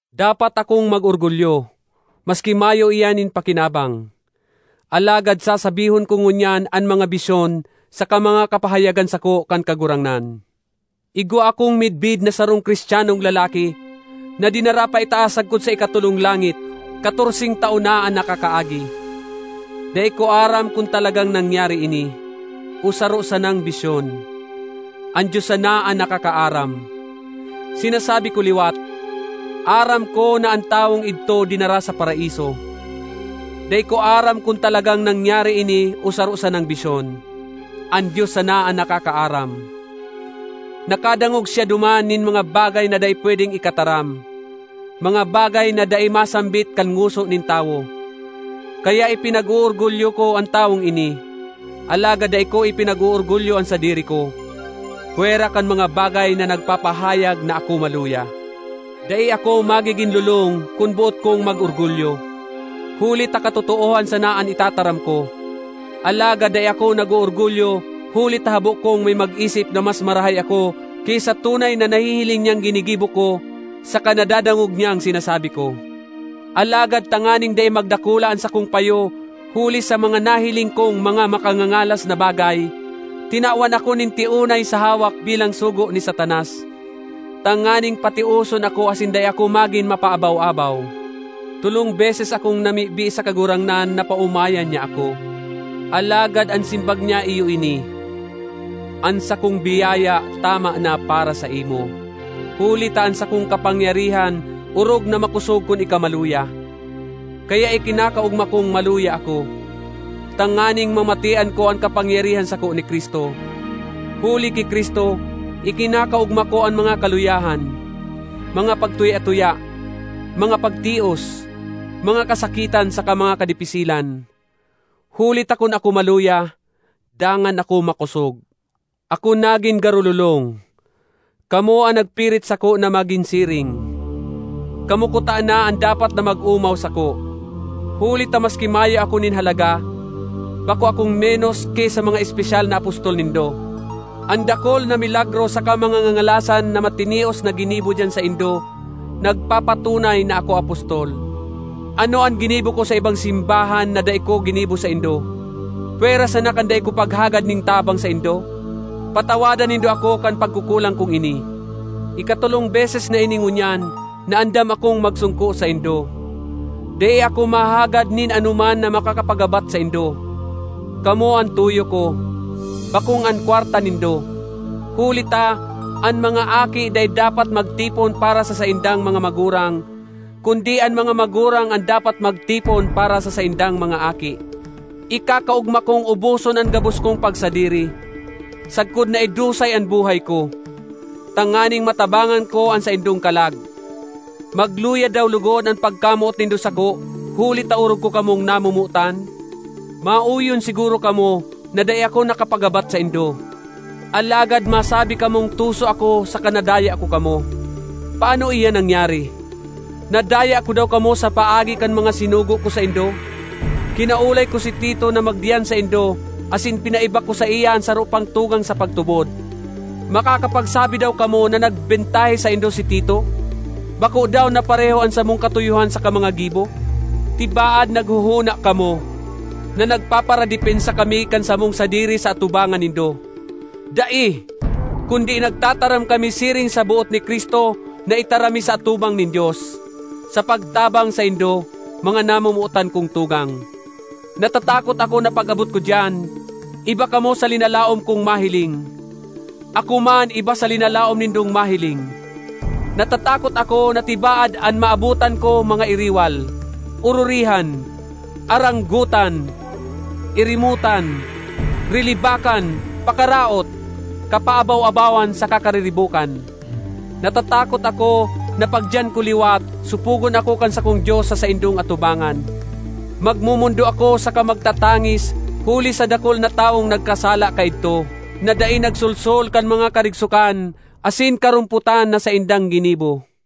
Dapat akong mag-orgulyo, maski mayo iyan nin pakinabang. Alagad sasabihon ko ngunyan an mga bisyon saka mga kapahayagan sako kan Kagurangnan. Igwa akong midbid na sarong Cristianong lalaki na dinara paitaas sagkod sa ikatolong langit, katorseng taon na an nakakaagi. (Dai ko aram kun talagang nangyari ini, o saro sanang bisyon—an Dios sana an nakakaaram). Sinasabi ko liwat, aram ko na an tawong idto dinara sa Paraiso. (Dai ko aram kun talagang nangyari ini o saro sanang bisyon—an Dios sana an nakakaaram). Nakadangog siya duman nin mga bagay na dai pwedeng ikataram, mga bagay na dai masambit kan ngoso nin tawo. Kaya ipinag-oorgulyo ko an tawong ini—alagad dai ko ipinag-oorgulyo an sadiri ko, pwera kan mga bagay na nagpapahayag na ako maluya. Dai ako magigin lolong kun boot kong mag-orgulyo, huli ta katotoohan sana an itataram ko. Alagad dai ako nag-oorgulyo huli ta habo kong may mag-isip na mas marahay ako ki sa tunay na nahihiling niyang ginigibo ko saka nadadangog niyang sinasabi ko. Alagad tanganing dai magdakula an sakong payo huli sa mga nahiling kong mga makangangalas na bagay, tinawan ako nin tiunay sa hawak bilang sugo ni Satanas, tanganing patioson ako asin dai ako magin mapaabaw-abaw. Tolong beses akong namibi sa Kagurangnan na paomayan niya ako. Alagad an simbag niya iyo ini: “An sakong biyaya tama na para saimo; huli ta an sakong kapangyarihan orog na makosog kun ika maluya.” Kaya ikinakaogma kong maluya ako, tanganing mamatean ko an kapangyarihan sako ni Cristo. Huli ki Cristo, ikinakaogma ko an mga kaluyahan, mga pagtuya-tuya, mga pagtios, mga kasakitan saka mga kadipisilan. Huli ta kun ako maluya, dangan ako makosog. Ako nagin garo lolong; kamo an nagpirit sako na magin siring. Kamo kutana an dapat na mag-omaw sako. Huli ta maski mayo ako nin halaga, bako akong menos ki sa mga espesyal na apostol nindo. An dakul na milagro saka mga ngangalasan na matinios na ginibo diyan saindo nagpapatunay na ako apostol. Ano an ginibo ko sa ibang simbahan na dai ko ginibo saindo, pwera sana kan dai ko paghagad nin tabang saindo? Patawada nindo ako kan pagkukulang kong ini! Ikatolong beses na ini ngunyan na andam akong magsongko saindo. Dai ako mahagad nin anoman na makakapagabat saindo. Kamo an tuyo ko, bakong an kwarta nindo; huli ta, an mga aki dai dapat magtipon para sa saindang mga magurang, kundi an mga magurang an dapat magtipon para sa saindang mga aki. Ikakaogma kong uboson an gabos kong pagsadiri, sagkod na idusay an buhay ko, tanganing matabangan ko an saindong kalag. Magluya daw logod an pagkamoot nindo sako huli ta orog ko kamong namomotan? Maoyon siguro kamo na dai ako nakapagabat saindo. Alagad masabi kamong tuso ako saka nadaya ko kamo. Paano iyan nangyari? Nadaya ko daw kamo sa paagi kan mga sinugo ko saindo? Kinaolay ko si Tito na magdiyan saindo asin pinaiba ko saiya an saro pang tugang sa pagtubod. Makakapagsabi daw kamo na nagbentahe saindo si Tito? Bako daw na pareho an samong katuyohan saka mga gibo? Tibaad naghohona kamo na nagpaparadepensa kami kan samong sadiri sa atubangan nindo. Dai! Kundi nagtataram kami siring sa boot ni Cristo na itaram mi sa atubang nin Dios, sa pagtabang saindo, mga namomotan kong tugang. Natatakot ako na pag-abot ko diyan, iba kamo sa linalaom kong mahiling; ako man iba sa linalaom nindong mahiling. Natatakot ako na tibaad an maabotan ko mga iriwal, ororihan, aranggotan, irimotan, rilibakan, pakaraot, kapaabaw-abawan saka kariribokan. Natatakot ako na pagdiyan ko liwat, sopogon ako kan sakong Dios sa saindong atubangan. Magmomondo ako saka magtatangis huli sa dakul na tawong nagkasala kaidto, na dai nagsolsol kan mga karigsokan asin karompotan na saindang ginibo.